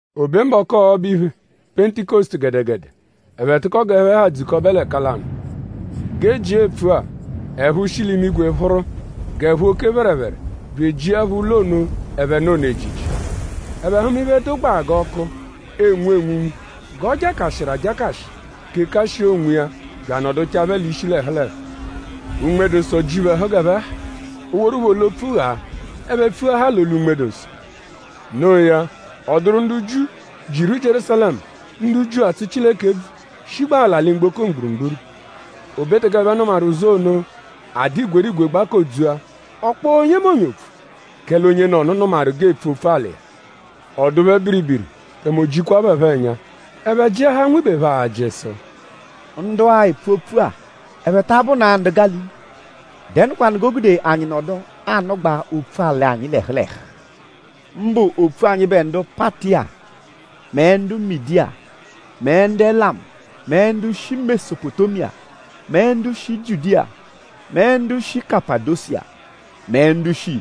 O be mbọku ọbo-iphe, Pentikọsutu gẹdegede; ẹphe tụko g'ẹphe ha dzukọbe l'ẹka lanụ. G'e jia epfua; ẹ̀phú shi l'imigwe phụru g'ẹ̀phú oke phẹrephere bya ejiẹpho ụlo ono, ẹphe nọ ono ejiji. Ẹphe hụma iphe, dụgbaa g'ọku, enwu enwunwu g'ọ jakashịru ajakashị kekashịa onwiya bya anọduchaa phẹ l'ishi l'ẹhu l'ẹhu. Unme-dụ-Nsọ ji phẹ ẹhu g'ẹphe ha; o woru phẹ olu-opfu ghaa. Ẹphe pfuahaa l'olu Unme-dụ-Nsọ. Noo ya; ọ dụru ndu Jiu, jiru Jierúsalẹmu; ndu Jiu, atsụ Chileke ebvu, shigbaa l'alị mgboko mgburugburu. O be teke ẹphe nụmaru ụzu ono; a dụ igwerigwe gbakodzua. Ọ kpọo onyemonye opfu; kẹle onyenọnu nụmaru g'eepfu opfu-alị iya. Ọ dụ phẹ biribiri; tẹme o jikwa phẹ phọ ẹnya. Ẹphe jịahaa nwibe phẹ ajị sụ: “Ndu-a, epfu opfu-a?ẹphe ta abụna-a ndu Gálili? ?Dẹnukwanu g'o gude anyi nọdu anụgbaa opfu-alị anyi l'ẹhu l'ẹhu? Mbụ opfu anyịbe ndu Patiya mẹ ndu Midiya mẹ ndu Elamu mẹ ndu shi Mesopotémiya mẹ ndu shi Jiudiya mẹ ndu shi Kapadosiya mẹ ndu shi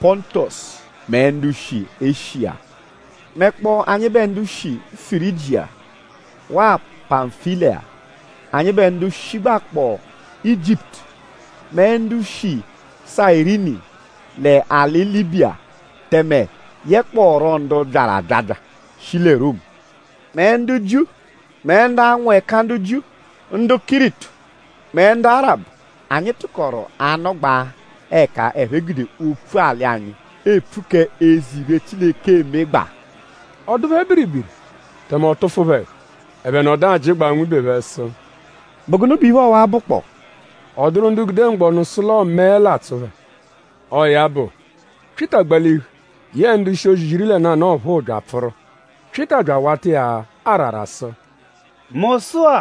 Pọntosu mẹ ndu shi Eshiya mẹkpoo anyịbe ndu shi Firijiya waa Pamfiliya anyịbe ndu shigbakpọo Ijiputu mẹ ndu shi Sayirini l'alị Libiya tẹme yekpọoru ndu byaru abyabya, shi lẹ Romu mẹ ndu Jiu mẹ ndu anwụ ẹka ndu Jiu; ndu Kiritu mẹ ndu Arabu anyi tụkoru anụgbaa ẹka ẹphe gude opfu-alị anyi epfu k'eze iphe, Chileke emegbaa.” Ọ dụ phẹ biribiri; tẹme ọ tụfu phẹ ẹhu. Ẹphe nọdu ajịgbaa nwibe phẹ sụ: “?Bụ gụnu bẹ iphe ọwa-a bụkpoo?” Ọ dụru ndu gude mgbọnu sụ l'ọo mẹe l'atsụ phẹ. Ọo ya bụ; Pyịta gbalihu yẹe ndu-ishi-ozi iri lẹ nanụ ọphuu bya apfụru. Pyịta bya awata iya arara sụ: “Mu sụ-a;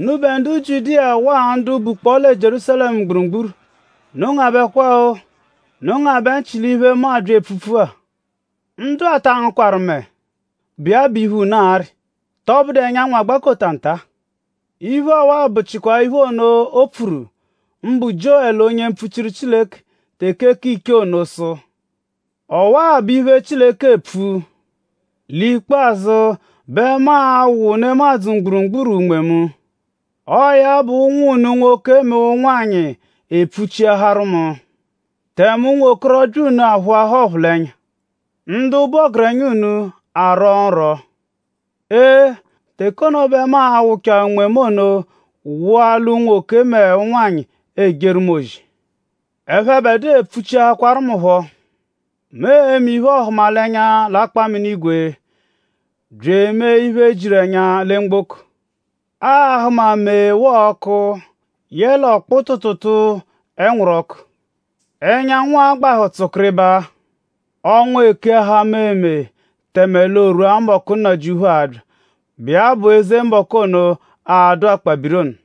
unubẹ ndu Jiudiya waa ndu bukpọo lẹ Jierúsalẹmu mgburugburu; unu gebekwa-o! Unu ngabẹ nchị l'iphe, mu abya epfupfu-a! Ndu-a ta angụkwaru mẹe, bụ iya bụ iphe, unu arị.?Tọbudu ẹnyanwu agbakota nta? Iphe ọwa-a bụchikwa iphe ono, o pfuru; mbụ Jiowẹlu onye mpfuchiru Chileke teke k'ichee ono sụ: “Ọwaa bụ iphe, Chileke epfu! L'ikpazụ bẹ mu a-wụ nemadzụ mgburugburu Unme mu. Ọo ya bụ; ụnwu unu unwoke mẹ ụnwanyi epfuchiaharu mu. Tẹme ụnwokorobya unu aphụa ọphulenya. Ndu bụ ọgerenya unu a-rwọ nrwọ. Ee! Teke ono bẹ mu a-wụchaa Unme mu ono wụa l'unwoke mẹ ụnwanyi, ejeru mu ozi. Ẹphebedua epfuchiahakwaru mu phọ. Mu e-me iphe-ọhumalenya l'akpaminigwe bya emee iphe, jiru ẹnya lẹ mgboko. Aa-hụma mee waa ọku yẹle ọkpu tụutuutuu ẹnwuru-ọku. Ẹnyanwu a-gbahụ tsụkiribaa. Ọnwa ekeahaa meemee tẹme l'o rwua mbọku Nnajịuphu a-bya, bụ iya bụ eze mbọku ono, a-dụ akpabiri ono.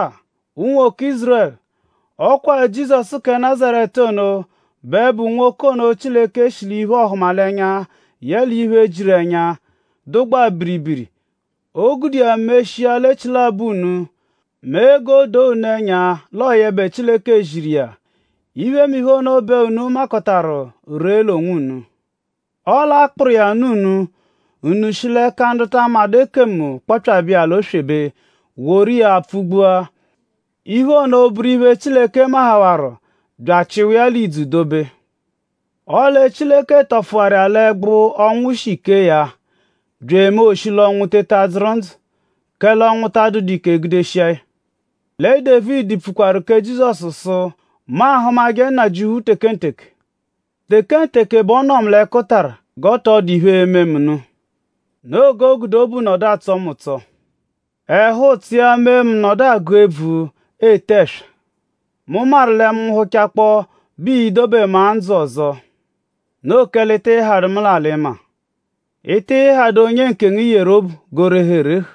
“Sụ-a; unwoke Ízurẹlu; ọ kwa Jizọsu kẹ Nazaretu ono bẹ bụ nwoke ono, Chileke shi l'iphe-ọhumalenya yẹle iphe, jiru ẹnya, dụgbaa biribiri, o gude iya meshia l'echilabọ unu; mee g'o doo unu ẹnya l'ọo yẹbe Chileke ziru iya. Iphemiphe ono bẹ unu makọtaru ree l'onwunu. Ọle a kpụru iya nụ unu; unu shi l'ẹka ndu ta amadụ ekemu kpọpyabe iya l'oswebe woru iya pfụ-gbua. Iphe ono bụru iphe, Chileke mahawarụ bya achịhawaa ya l'ìdzù dobe. Ọle Chileke tọfuwaru iya l'ẹgbu, ọnwu shi kee ya bya emee o shi l'ọnwu teta dzụru ndzụ; kẹle ọnwu ta adụdu ike gudeshia ya. Lẹ Dévidi pfukwaru kẹ Jizọsu sụ: “Mu ahụmaje Nnajịuphu tekenteke. Tekenteke bẹ ọ nọ mu l'ẹkutara g'ọ tọ dụ iphe, e-me mu nụ. Noo g'o gude obu nọdu atsọ mu ụtso. Ẹhu-ụtso iya mee mu nọdu agụ ebvu; ete ẹswa. Mu maru lẹ mu -nwụhuchakpoo bẹ ii-dobe mu-a ndzụ ọzo. Noo kẹle ị tịi hadụ mu l'alị-maa. Ị tịi hadụ onye nkengu, i yeru obu g'o rehu erehu.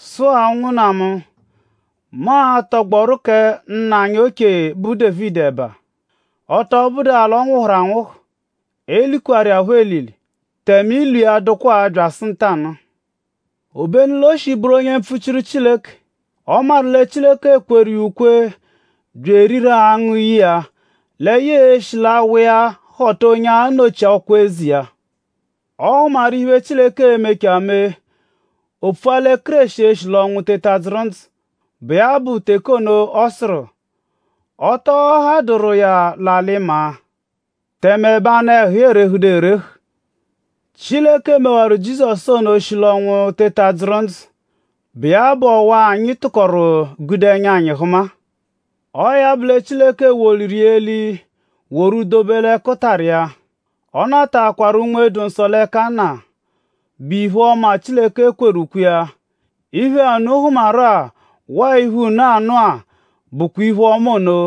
“Sụ-a; ụnwunna mu; mu a-tọgboru kẹ nna anyi oche, bụ Dévidi ẹba. Ọ tọ bụdua l'ọ nwụhuru anwụhu; e likwarụ iya phọ elili; tẹme ilu iya dụkwa-a byasụ ntanụ-a. Obenu l'o shi bụru onye mpfuchiru Chileke. Ọ maru lẹ Chileke kweru iya ukwe bya eriru angụ ye iya lẹ ya e-shi l'awa iya họta onye a-nọchi ọkwa eze iya. Ọ hụmaru iphe, Chileke e-mechaa mee. O pfua lẹ Kéreshi e-shi l'ọnwu teta dzụru ndzụ, bụ iya bụ teke ono, ọ sụru: “Ọ tọ hadụru iya l'alị-maa. Tẹme ẹbe anụ-ẹhu iya erehuduru erehu.” Chileke mewaru Jizọsu ono o shi l'ọnwu teta dzụru ndzụ, bụ iya bụ ọwa-a, anyi tụkoru gude ẹnya anyi hụma-a. Ọo ya bụ lẹ Chileke woliru iya eli woru dobe l'ẹkutara iya. Ọ nataakwaru Unme-dụ-Nsọ l'ẹka Nna, bụ iphe-ọma, Chileke kweru ukwe iya. Iphe-a, unu hụmaru-a waa iphe-a, unu anụ-a bụkwa iphe-ọma ono,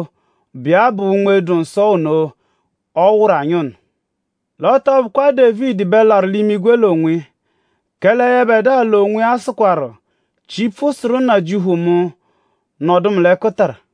bụ iya bụ Unme-dụ-Nsọ ono, ọ wụru anyi ono. L'ọ tọ bụkwa Dévidi bẹ larụ l'imigwe l'onwiya; kẹle yẹbedua l'onwiya sụkwaru: “Chipfu sụru Nnajịuphu mu: Nọdu mu l'ẹkutara;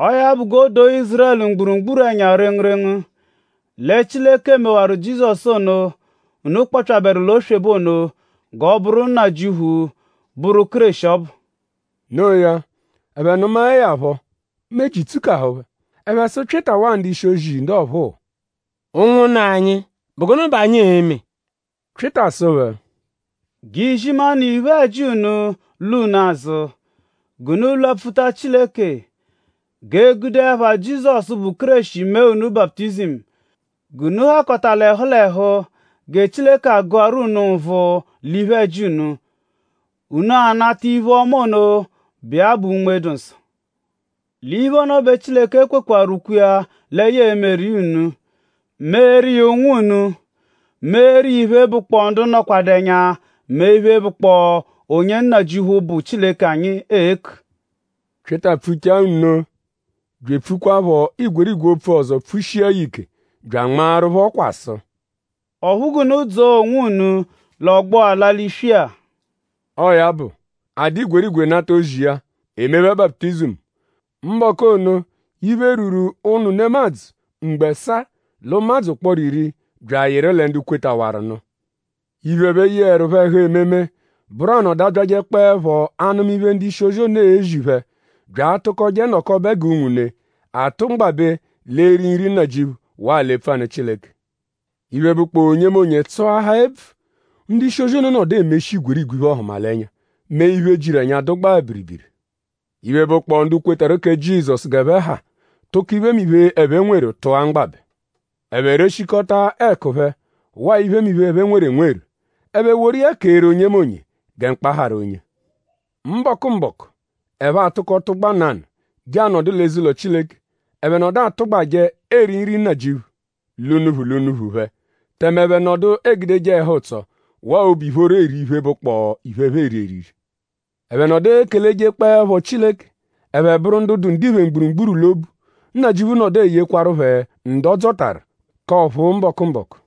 “Ọo ya bụ; g'o doo Ízurẹlu mgburugburu ẹnya rengurengu lẹ Chileke mewaru Jizọsu ono, unu kpọpyaberu l'oswebe ono g'ọ bụru Nnajịuphu bụru Kéreshi ọbu.” Noo ya; ẹphe nụmae ya phọ; meji tsukahụ phẹ. Ẹphe sụ Pyịta waa ndu-ishi-ozi ndu ọphuu: “Ụnwunna anyi;?bụ gụnu bẹ anyi e-me?” Pyịta sụ phẹ: “G'izimanụ iphe-ẹji unu lwa unu azụ; g'unu lwapfuta Chileke; g'e gude ẹpha Jizọsu, bụ Kéreshi mee unu baputizimu g'unu hakọta l'ẹhu l'ẹhu gẹ Chileke agụaru unu nvụ l'iphe-ẹji unu; unu a-nata iphe-ọma ono, bụ iya bụ Unme-dụ-Nsọ. L'iphe ono bẹ Chileke kwekwaru ukwe lẹ ya e-meru unu; meeru iya ụnwu unu; meeru iya iphe, bụkpoo ndu nọkwadu ẹnya mẹ iphe, bụkpoo onye Nnajịuphu, bụ Chileke anyi e-ku.” Pyịta pfuchaa nno bya epfukwaaphọ igwerigwe opfu ọzo pfushia ya ike bya anmaaru phẹ ọkwa sụ: “Ọphu g'unu dzọo onwunu l'ọgbo-a, a-la l'iswi-a.” Ọo ya bụ; a dụ igwerigwe nata ozi iya; e mee phẹ baputizimu. Mbọku ono; iphe, rwuru ụnu nemadzụ mgbo ẹsaa l'ụmadzu ụkporo iri bya ayịru lẹ ndu kwetawaru nụ. Iphe, ẹphe yeẹrupho ẹhu ememe bụru anọdu abyajẹkpoepho anụma iphe, ndu-ishi-ozi ono ezi phẹ bya atụkoje nọkobe g'unwune; atụ mgbabẹ l'eri Nri Nnajịuphu waa l'epfu anụ Chileke. Iphe, bụkpoo onyemonye tsụahaa ebvu. Ndu-ishi-ozi ono nọdu emeshi igwerigwe iphe-ọhumalenya mẹ iphe, jiru ẹnya, dụgbaa biribiri. Iphe, bụkpoo ndu kwetarụ kẹ Jizọsu g'ẹphe ha tụko iphemiphe, ẹphe nweru tụa mgbabẹ. Ẹphe reshikọta ẹku phẹ waa iphemiphe, ẹphe nweru enweru. Ẹphe woru iya keeru onyemonye gẹ mkpa harụ onye. Mbọku-mbọku; ẹphe atụko tụgba nanụ je anọdu l'eze-ụlo Chileke. Ẹphe nọdu atụgbaje eri Nri Nnajịuphu l'unuphu l'unuphu phẹ; tẹme ẹphe nọdu egudeje ẹhu-ụtso waa obu ìphóró eri iphe, bụkpoo iphe, ẹphe eri eriri. Ẹphe nọdu ekelejekpẹepho Chileke. Ẹphe bụru ndu dụ ndiphe mgburugburu l'obu. Nnajịuphu nọdu eyekwaru phẹ ndu ọ dzọtaru k'ọ̀phúú mbọku-mbọku.